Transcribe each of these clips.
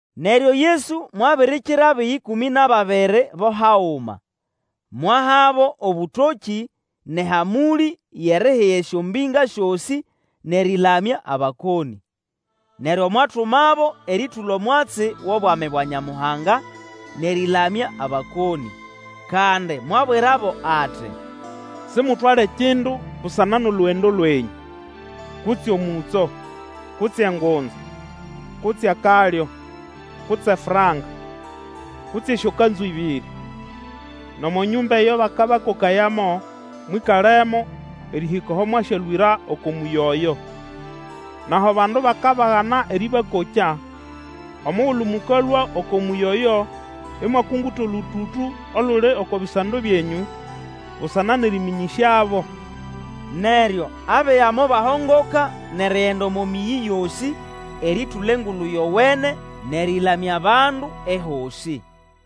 Neryo Yesu mwabirikira abiga ĩkũmĩ nʼababiri bo haguma, mwahabo obũtokĩ nʼehamũlĩ yʼerihiga esyombĩnga syosĩ, nʼerĩlamya abakonĩ. Neryo mwatumabo erĩtũla omwatsi wʼobwami bwa Nyamuhanga nʼerĩlamya abakonĩ. Kandi mwabwirabo ati, Simutwale kindu busana nʼolugendo lwenyũ, kutse omũtso, kutse engunza, kutse akalyo, kutse franka, kutse esyokanzu ĩbĩrĩ. Nʼomo nyũmba eyo bakabakokayamo, mwĩkalemo erĩhĩka aho mwasyalũĩra oko mũyi oyo. Nʼaho abandu bakagana erĩbakokya, omugulu mũkalũa oko mũyĩ oyo imwakunguta olũtũtũ oluli oko bisando byenyũ, busana nʼerĩmĩnyĩsyabo. Neryo abiga mobahongoka nʼerigenda omo mĩyĩ yosĩ, erĩtũla Engulu Yowene, nʼerĩlamya abandu ehosĩ.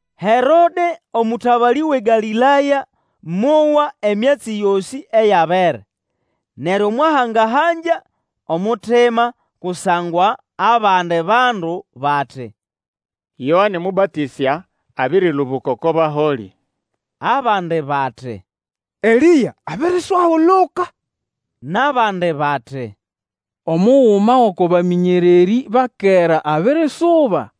Herode, omũtabalĩ wʼeGalĩlaya, mowa emyatsi yosĩ eyabere, neryo mwahanga-hangya omutima, kusangwa abandi bandu bati, Yoane Mũbatĩsya abĩrĩlũbũka oko baholĩ! Abandi bati, Elĩa abiriswahuluka, nʼabandi bati, Omuguma gʼoko bamĩnyererĩ ba kera abirisuba.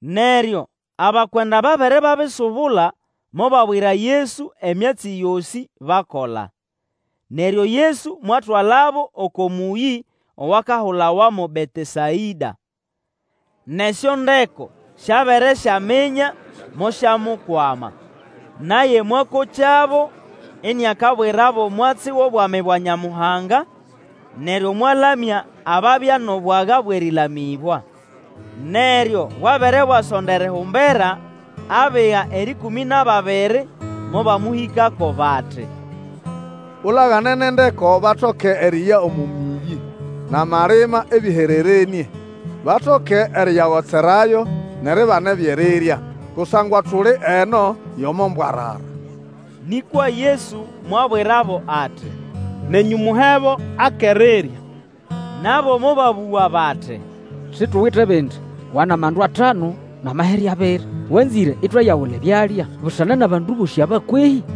Neryo abakwenda babere babisubula, mobabwira Yesu emyatsi yosĩ bakola. Neryo Yesu mwatwalabo oko mũyĩ owakahulawa mo Betesaĩda. Nʼesyondeko syabere syaminya, mosyamukwama. Naye mwakokyabo, iniakabwirabo omwatsi wʼobwami bwa Nyamuhanga, neryo mwalamya ababya nʼobwaga bwʼerĩlamĩbwa. Neryo bwabere bwasonda erihumbera, abiga erĩkũmĩ nʼababiri mobamũhikako bati, Ulagane nʼendeko batoke eriya omo mĩyĩ nʼamalima ebĩhererenĩe, batoke eriyagotserayo nʼeribana ebyʼerirya; kusangwa tuli eno yʼomo mbwarara. Nĩkwa Yesu mwabwirabo ati, Nenyũ muhebo akʼerirya. Nabo mobabũga bati, Situwite bindi, wa nʼamandu atanu nʼamahere abiri. Wanzĩre itwayagula ebyalya busana nʼabandu bosĩ aba kwehĩ?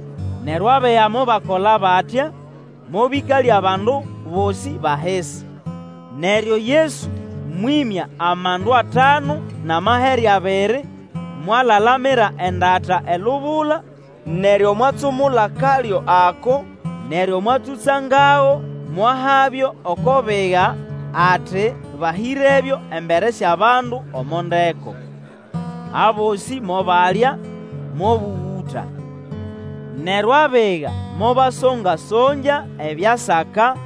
Neryo abiga mobakola batya, mobĩkalya abandu bosĩ bʼahisi. Neryo Yesu mwĩmya amandu atanu nʼamahere abiri, mwalalamira endata elubula, neryo mwatsumula kalyo ako, neryo mwatsũtsangago mwahabyo oko biga ati bahĩrebyo embere syʼabandu omo ndeko. Abosĩ mobalya, mobũgũta. Neryo abiga mobasonga-songya ebyasaka,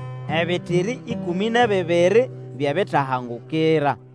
ebitiri ĩkũmĩ nʼebibiri byʼebitahangukira.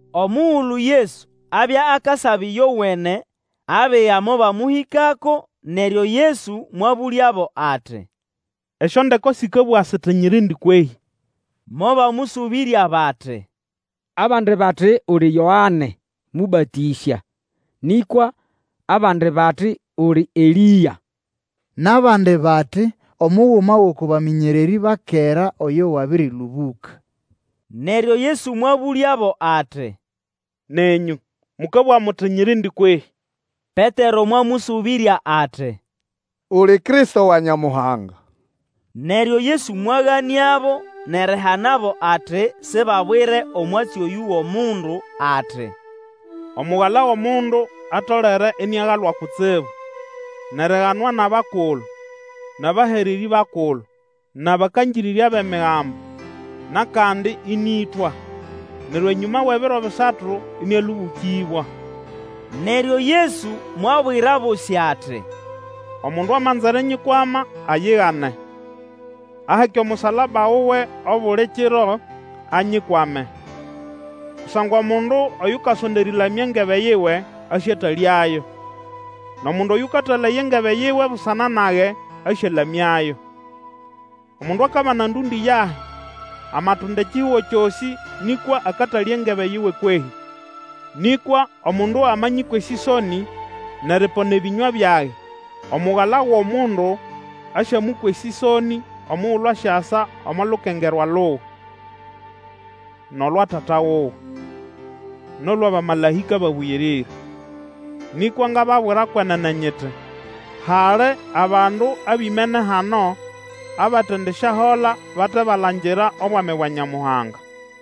Omugulu Yesu abya akasaba ĩyowene, abiga mobamũhĩkako, neryo Yesu mwabũlyabo ati, Esyondeko sĩkabũga siti nyirindi kwehĩ? Mobamũsũbĩrya bati, Abandi bati uli Yoane Mũbatĩsya, nĩkwa abandi bati uli Elĩa, nʼabandi bati, omuguma gʼoko bamĩnyererĩ ba kera oyo wabĩrĩlũbũka. Neryo Yesu mwabũlyabo ati, Nenyũ, mũkabũga muti nyirindi kwehĩ? Petero mwamũsũbĩrya ati, Uli Kristo wa Nyamuhanga. Neryo Yesu mwaganĩabo nʼerihanabo ati sibabwire omwatsi oyũ go mundu, ati, Omugala wʼOmundu atolere iniagalwa kutsibu, nʼeriganwa nʼabakulu, nʼabahererĩ bakulu, nʼabakangĩrĩrya bʼEmigambo nʼakandi ĩnĩĩtwa, neryo enyũma wʼebiro bisatu ĩnĩalũbũkĩbwa. Neryo Yesu mwabwira abosĩ ati, Omundu amanza erinyikwama, ayigane, aheke omusalaba wuwe obuli kiro, anyikwame. Kusangwa omundu Oyukasonda erĩlamya engebe yiwe asyatalyayo; nʼomundu Oyũkatalaya engebe yiwe busana nage asyalamyayo. Omundu akabana endũndĩ yahi; amatunda ekihugo kyosĩ nĩkwa akatalya engebe yiwe kwehĩ? Nĩkwa omundu amanyĩkwa esĩsonĩ, nʼeripona ebĩnywa byage, Omugala wʼOmundu asyamũkwa esĩsonĩ omugulu asyasa omo lukengerwa luwe, nʼolwa Tata wuwe, nʼolwʼabamalaĩka babũyĩrĩre. Nĩkwa ngababwira kwenene nyiti, Hali abandu abimene hano, abatendisyahola bate balangira Obwami bwa Nyamuhanga.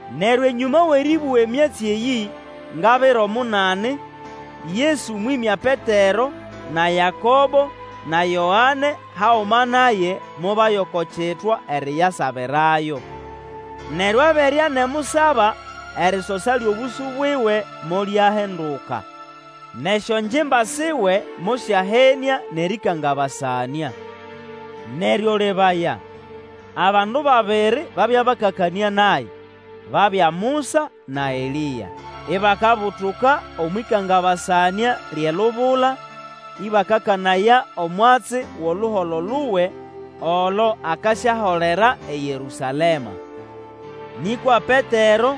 Neryo enyũma wʼerĩbũga emyatsi eyĩ, nga biro munani, Yesu mwĩmya Petero na Yakobo na Yoane haguma naye, mobaya oko kitwa eriyasabirayo. Neryo abere anemusaba, erisosa lyʼobũsũ buwe molyahinduka, nʼesyongimba siwe mosyahenĩa nʼerĩkangabasanĩa. Neryo lebaya, abandu babiri babya bakakanĩa naye; babya Musa na Elĩa. Ibakabutuka omwʼĩkangabasanĩa lyʼelubula, ĩbakakanaya omwatsi wʼoluholo luwe olo akasyaholera eYerũsalema. Nĩkwa Petero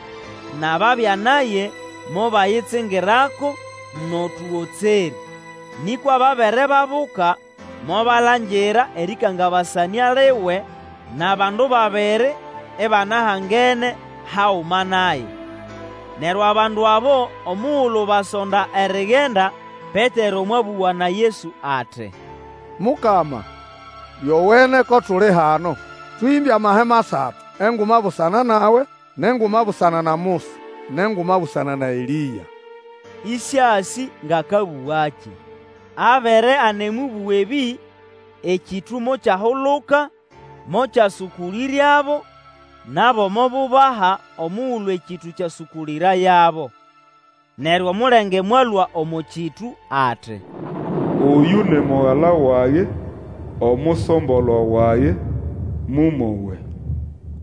nʼababya naye mobayitsingirako nʼotũgotserĩ; nĩkwa babere babuka, mobalangira erĩkangabasanĩa liwe nʼabandu babiri ibanahangene haguma naye. Neryo abandu abo omugulu basonda erigenda, Petero mwabũga na Yesu ati, Mukama, lyowene ko tuli hano; tũhĩmbe amahema asatu, enguma busana nawe, nʼenguma busana na Musa, nʼenguma busana na Elĩa, ĩsĩasĩ ngʼakabũgakĩ. Abere anemũbũga ebĩ, ekĩtũ mokyahuluka mokyasũkũlĩryabo; nabo mobubaha omugulu ekĩtũ kyasũkũlĩrayabo. Neryo omulenge mwalũa omo kĩtũ ati, Oyũ ni Mugala wage, Omusombolwa wage; mũmowe!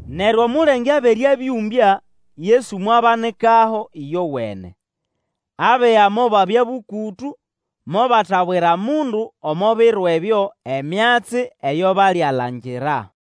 Neryo omulenge abere abĩũmbya, Yesu mwabanikaho ĩyowene. Abiga mobabya bũkũtũ, mobatabwira mundu omo biro ebyo emyatsi eyo balialangira.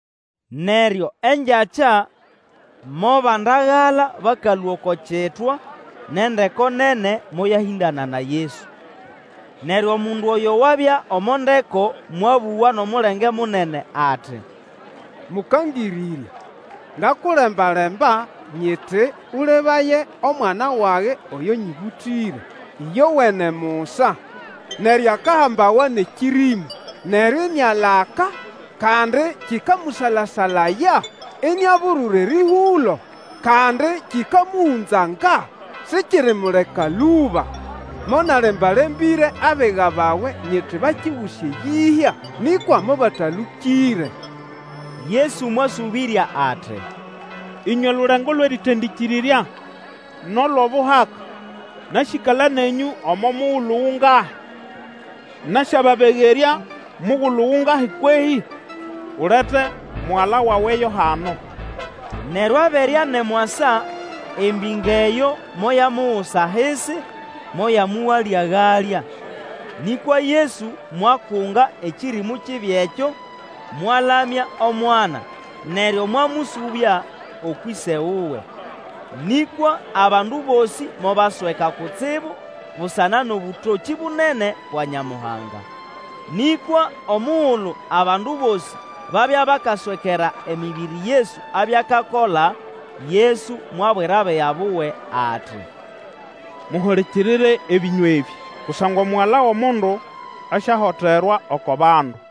Neryo engyakya mobandagala bakalũa oko kitwa, nʼendeko nene moyahĩndana na Yesu. Neryo omundu oyo wabya omo ndeko mwabũga nʼomulenge munene ati, Mũkangĩrĩrya! ngakulembalemba nyiti Ũlebaye omwana wage oyo nyĩbũtĩre, ĩyowene musa! Neryo akahambawa nʼekĩrĩmũ, neryo inialaka, kandi kĩkamũsala-salaya, iniaburura erĩhũlo, kandi kĩkamũhũnzanga, sikirimuleka lũba. Monalemba-lembĩre abiga bawe nyiti bakiguse eyĩhya, nĩkwa mobatalũkĩre. Yesu mwasũbĩrya ati, Ĩnywe lulengo lwʼerĩtendĩkĩrĩrya nʼolwʼobuhaka, nasyĩkala nenyũ omo mugulu gungahi, nasyababegerya mugulu gungahi kwehĩ? Ulete mugala wawe yo hano. Neryo abere anemwasa embĩnga eyo moyamugusa ahisi, moyamũgala-galya. Nĩkwa Yesu mwakunga ekĩrĩmũ kibi ekyo, mwalamya omwana, neryo mwamũsũbya ũkwʼĩse wuwe. Nĩkwa abandu bosĩ mobasweka kutsibu busana nʼobũtokĩ bunene bwa Nyamuhanga. Nĩkwa omugulu abandu bosĩ babya bakaswekera emĩbĩrĩ Yesu abya akakola, Yesu mwabwira abiga buwe ati, Muhulikirire ebĩnywa ebĩ, kusangwa Omugala wʼOmundu asyahoterwa oko bandu.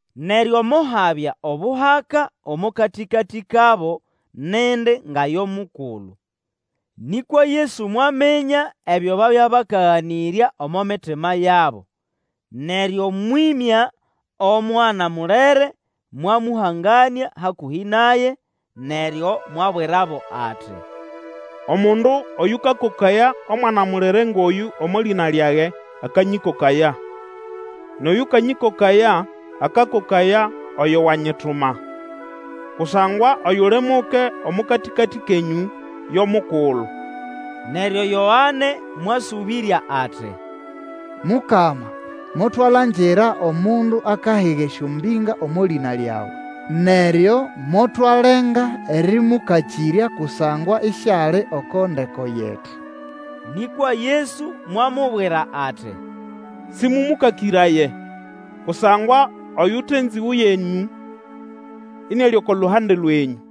Neryo mohabya obuhaka omo katĩkatĩ kabo nindi nga yo mukulu. Nĩkwa Yesu mwaminya ebyo babya bakaganĩrya omo mitima yabo, neryo mwĩmya omwana mulere mwamũhanganĩa hakũhĩ naye, neryo mwabwirabo ati, Omundu oyũkakokaya omwana mulere ngʼoyũ omo lĩna lyage akanyĩkokaya; nʼoyũkanyĩkokaya, akakokaya oyo wanyituma. Kusangwa oyuli muke omo katĩkatĩ kenyũ yo mukulu. Neryo Yoane mwasũbĩrya ati, Mukama motwalangira omundu akahiga esyombĩnga omo lĩna lyawe; neryo motwalenga erĩmũkakĩrya kusangwa isiali oko ndeko yetu. Nĩkwa Yesu mwamubwira ati, Sĩmũmũkakĩraye, kusangwa oyute nzĩgũ yenyũ iniali oko luhande lwenyũ.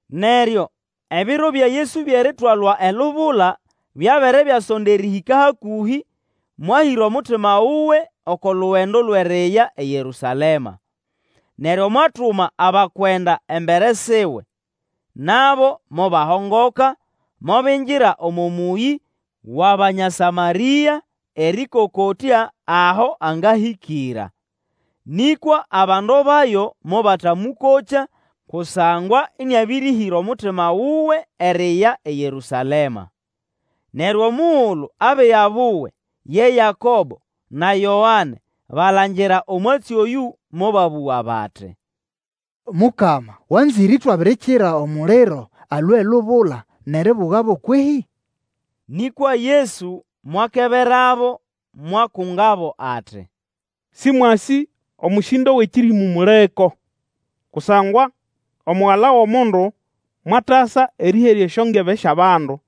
Neryo ebiro bya Yesu byʼeritwalwa elubula byabere byasonda erĩhĩka hakũhĩ, mwahĩra omutima wuwe oko lugendo lwʼeriya eYerũsalema. Neryo mwatuma abakwenda embere siwe. Nabo mobahongoka, mobingira omo mũyĩ wʼAbanya Samarĩa, erĩkokotya aho angahĩkĩra. Nĩkwa abandu bayo mobatamũkokya kusangwa ĩnĩabĩrĩhĩra omutima wuwe eriya eYerũsalema. Neryo omugulu abiga buwe, ye Yakobo na Yoane balangira omwatsi oyũ, mobabũga bati, Mukama, wanzĩre itwabirikira omuliro alũe elubula nʼeribugabo kwehĩ? Nĩkwa Yesu mwakeberabo, mwakungabo ati, Sĩmwasĩ omũsĩndo wʼekĩrĩmũ muliko. Kusangwa Omugala wʼOmundu mwatasa erĩherya esyongebe syʼabandu,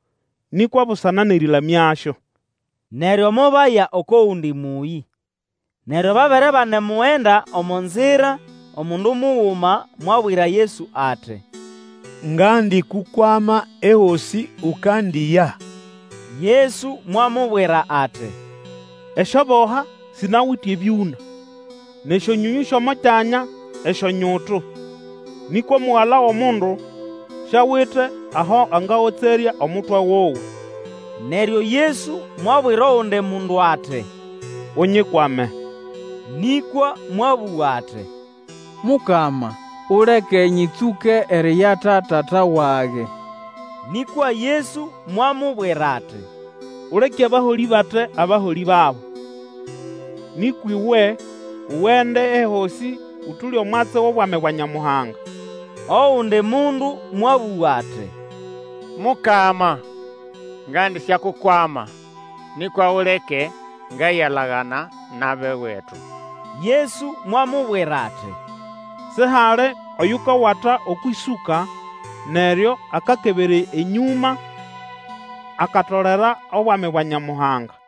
nĩkwa busana nʼerĩlamyasyo. Neryo mobaya oko gundi mũyĩ. Erikwama Yesu nĩkĩ? Neryo babere banemugenda omo nzira, omundu muguma mwabwira Yesu ati, Ngandikukwama ehosĩ ukandiya. Yesu mwamubwira ati, Esyoboha sinawite ebyũna, nʼesyonyonyũ syʼomo kyanya esyonyutu; nĩkwa Omugala wʼOmundu siawite aho angagotserya omutwe wuwe. Neryo Yesu mwabwira ogundi mundu ati, Unyikwame; nĩkwa mwabũga ati, Mukama, uleke nyĩtsũke eriyata tata wage. Nĩkwa Yesu mwamubwira ati, Uleke abaholĩ bate abaholĩ babo. Nĩkwa uwe ugende ehosĩ ũtũle omwatsi wʼobwami bwa Nyamuhanga. Ogundi mundu mwabũga ati, Mukama, ngandisyakukwama, nĩkwa uleke ngayalagana nʼabʼewetu. Yesu mwamubwira ati, Sihali oyukawata okwʼĩsũka neryo akakebera enyũma, akatolera obwami bwa Nyamuhanga.